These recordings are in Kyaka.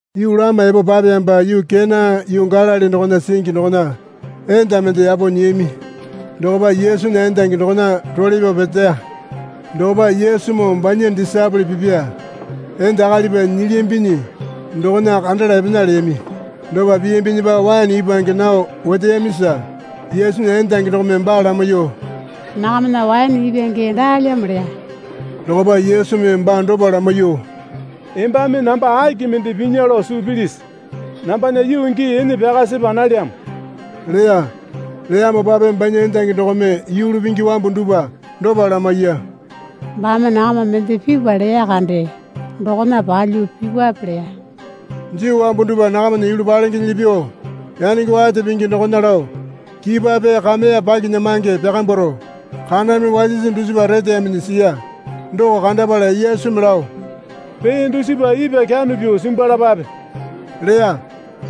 Yuu lama epo papeyamopa yuu Kena yuu Galili dokona singi dokona enda mende yapo nyiyami. Dokopa Yesunya endangi dokona role pyao peteya. Dokopa Yesumoo banya disaepole pipya enda akalipa nyilyambinyi dokona kandala epena leyami. Dopa piyambinyipa waene ipwange nao oteyamisa Yesunya endangi dokome baa lamaiyuo, Nakamana waene ipwange daalyamo leya. Dokopa Yesumi baa dopa lamaiyuo, Embame namba aki mende pinya lao suu pilisi? Nambana yuu gii ene pyaka sepa nalyamo leya. Leyamopape banya endangi dokome yulu pingi wambu dupwa dopa lamaiya. Baame nakama mende pipwa leya kande dokona palyuo pipwape leya. Juu wambu dupwa nakamana yulu palengenyili pyuo yanenge wate pingi dokona lao kipwa pee kameya pakinyamange pyakambwaro kaname wasisi dusipa reteyaminyi siya. Doko kandapala Yesumi lao, Pee dusipa ipwa kyano pyuo simbwalapape leya.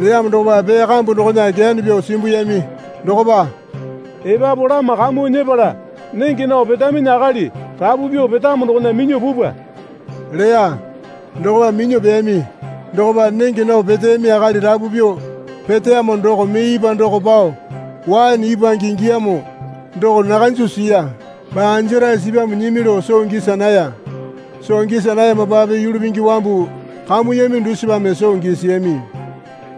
Leyamo dokopa pee kambu dokona kyano pyuo simbuyami. Dokopa, Epapu lama kamuo nyepala nenge nao petaminyi akali rapu pyuo petamo dokona minyuo pupwa leya. Dokopa minyuo peyami. Dokopa nenge nao peteyami akali rapu pyuo peteyamo doko mee ipwa doko pao waene ipwange ingiyamo doko nakanju siya. Baa anjarae sipyamo nyimi lao soo gisa naya. (Soo gisa nayamopape yulu pingi wambu kamuyami dusipame soo gisiyami.)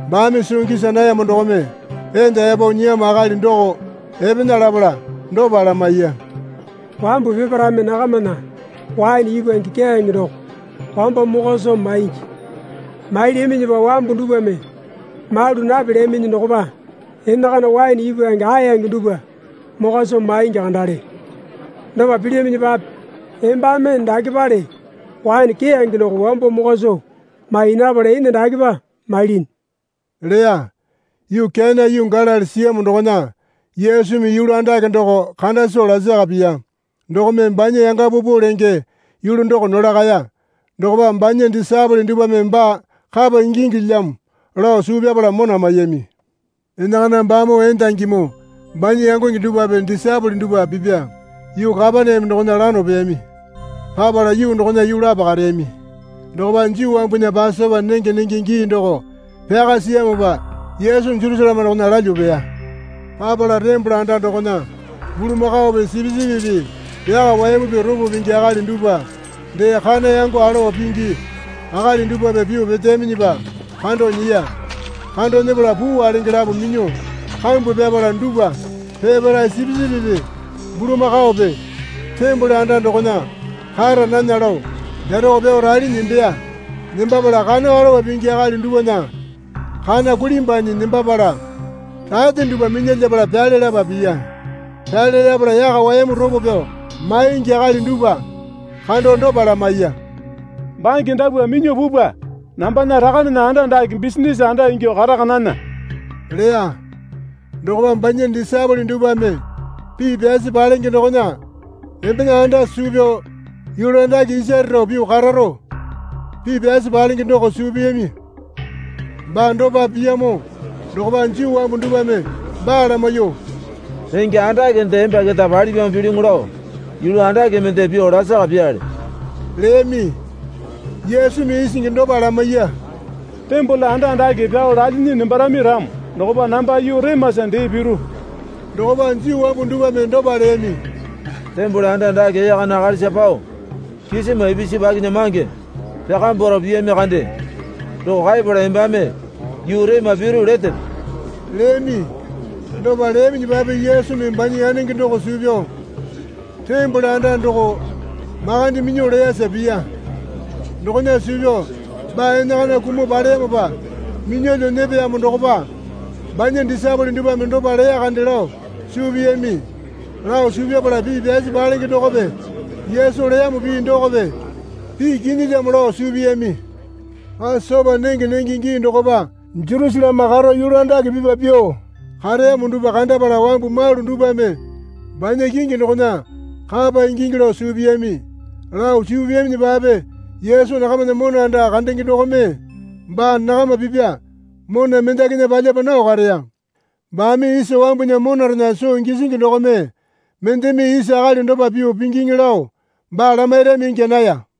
Baame soo gisa nayamo dokome enda yapo nyiyamo akali doko epena lapala dopa lamaiya. Wambu peparaeme nakamana waene ipwange keyange doko wambo mokwa soo maingi. Mailyaminyipa wambu dupwame malu napelyaminyi dokopa enakana waene ipwange aeyange dupwa mokwa soo maingi kandale. Dopa pilyaminyipape embame dakepale waene keyange doko wambo mokwa soo mai napala ene dakepa mailinyi leya. Yuu Kena yuu Galili siyamo dokona Yesumi yulu andake doko kanda soo lasaka piya. Dokome banya yanga paupau lenge yulu doko nolakaya. Dokopa banya disaepole dupwame baa kapa ingingilyamo lao suu pyapala mona maiyami. Enakana baamoo endangimoo banya yangonge dupwape disaepole dupwa pipya yuu Kapaneame dokona lano peyami. Papala yuu dokona yuu lapo kareyami. Dokopa Juu wambunya Pasopa nenge nenge gii doko pyaka siyamopa Yesu Jerusaleme dokona lalyuo peya. Papala tembole anda dokona bulamakaope sipisipipi, yaka wayamupi ropo pingi akali dupwa dee kana yango alowa pingi akali dupwape pyuo peteyaminyipa kando nyiya. Kando nyepala puu walenge lapo minyuo kambwa pyapala dupwa peparae sipisipipi bulamakaope tembole anda dokona kara nana lao pyaroko pyao ralinyi nembeya. Nembapala kana alowa pingi akali dupwana kana kulimbwanyi nembapala rate dupwa minyalyapala pyale lapa piya. Pyale lapala yaka wayamu ropo pyao maingi akali dupwa kando dopa lamaiya. Bange dapwa minyuo pupwa. Nambana Rakanena anda dake bisinase anda ingyuo karaka nana leya. Dokopa banya disaepole dupwame pii pyasi palenge dokona, Embena anda suu pyao yulu andake isare rao pyuo kararo, pii pyasi palenge doko suu piyami. Baa dopa piyamo dokopa Juu wambu dupwame baa lamaiyuo, Renge andakende emba keta palipyamo pilyuŋu lao yulu andake mende pyuo lasaka pyaale leyami. Yesumi isingi dopa lamaiya. Tembole anda dake pyao lalinyi nembarami ramo dokopa namba yuu remasa dee piru. Dokopa Juu wambu dupwame dopa leyami. Tembole anda dake ee kana akalisa pao kisima ipisu pakinyamange pyakambwaro piyami kande doko kaepala embame yuu rema piru letepe? leyami. Dopa leyaminyipape Yesumi banya yanenge doko suu pyao tembole anda doko makande minyuo leyasa piya. Dokona suu pyao baa enakana kumuo paleyamopa minyalyuo nyepeyamo dokopa banya disaepole dupwame dopa leya kande lao suu piyami. Lao suu pyapala pii pyasi palenge dokope Yesu leyamo pii dokope pii kinyilyamo lao suu piyami. Pasopa nenge nenge gii dokopa Jerusaleme karo yulu andake pipa pyuo kareyamo dupwa kandapala wambu malu dupwame banya kingi dokona kapa ingingi lao suu piyami. Lao suu piyaminyipape Yesu nakamana mona anda kandenge dokome baa nakama pipa mona mendakinya palyapa nao kareya. Baame isa wambunya monarena soo gisingi dokome mendeme isa akali dopa pyuo pingiŋi lao baa lamairami ingya naya.